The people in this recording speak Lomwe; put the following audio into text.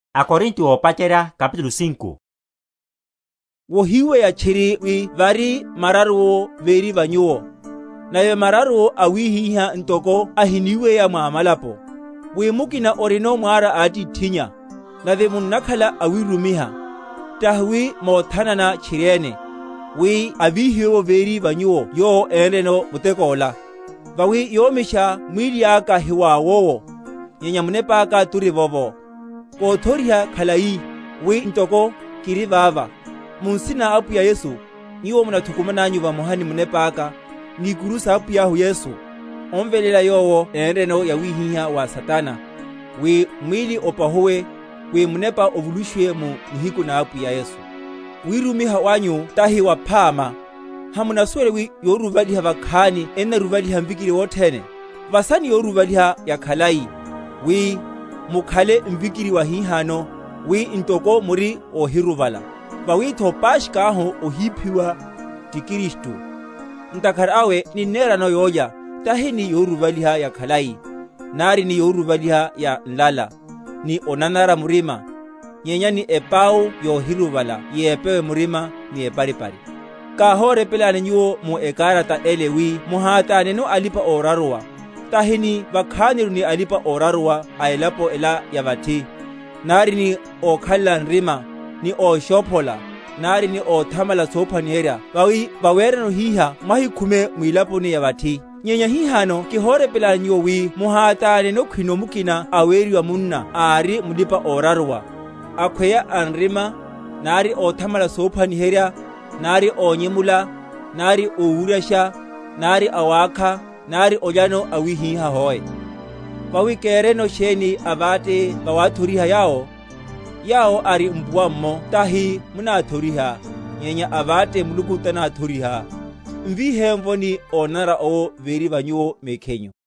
Sa mararuwo m’muloko wó Korinto; solaka ni solopola. Wohiweya tchiri wi vari mararuwo véri va nyuwo, nave mararuwo awihiha ntoko ahiníweya mwa amalapo, wi mukina orinono mwara a atithinnya. Nave munnakhala awírumiha, tahi wi mothanana tchiriene, wi avihiwe’vo véri va nyuwo yowo énreno muteko yola. Vawi yómisha, mwíli aka hiwawowo, nyenya munepáka turivovo, kothoriha khalai, wi ntoko kiri vava, mu nsina na Apwiyahu Yesu, nyuwo munathukumananyu vamoha ni munepáka, ni ikuru sa Apwiyahu Yesu, omveléla yowo énreno yawihiha wa Satana, wi mwíli opahuwe, wi munepa ovulushiwe mu nihiku na Apwiya Yesu. Wírumiha wanyu tahi waphama. Hamunasuwela wi yoruruvaliha vakhani ennaruruvaliha mvikiri wothene? Vasani yoruruvaliha yakhalai, wi mukhale mvikiri wahihano, wi ntoko muri óhiruruvala. Vawitho Paskha ahu ohíphiwa, ti Kristu; ntakhara awe ninnerano yólya, tahi ni yoruruvaliha yakhalai, nari ni yoruruvaliha ya nlala, ni onanara murima, nyenya ni epau yohiruruvala yepewe murima, ni eparipari. Káhórepelani nyuwo mu ekarata ele, wi muhátáneno alipa‐oraruwa; tahi ni vakhaniru ni alipa‐oraruwa a elapo ela ya vathi, nari ni ókhalela nrima, ni óshophola, nari ni óthamala sophwaniherya; vawi vawerano hihá mwahikhume mwilaponi ya vathi; nyenya hihano kihorepelani nyuwo wi muhátáneno, khwino mukina aweriwa munna ári mulipa‐oraruwa, akhweya anrima, nari óthamala sophwaniherya, nari ónyemula, nari ówuryasha, nari awákha, nari olyano awihiha, hoe. Vawi kereno sheni aváte vawathoriha yawo? Yawo ari mpuwa’mmo tahi munáthoriha, nyenya aváte Muluku tanáthoriha? Mvihemvoni onanara owo véri va nyuwo mekhinyu.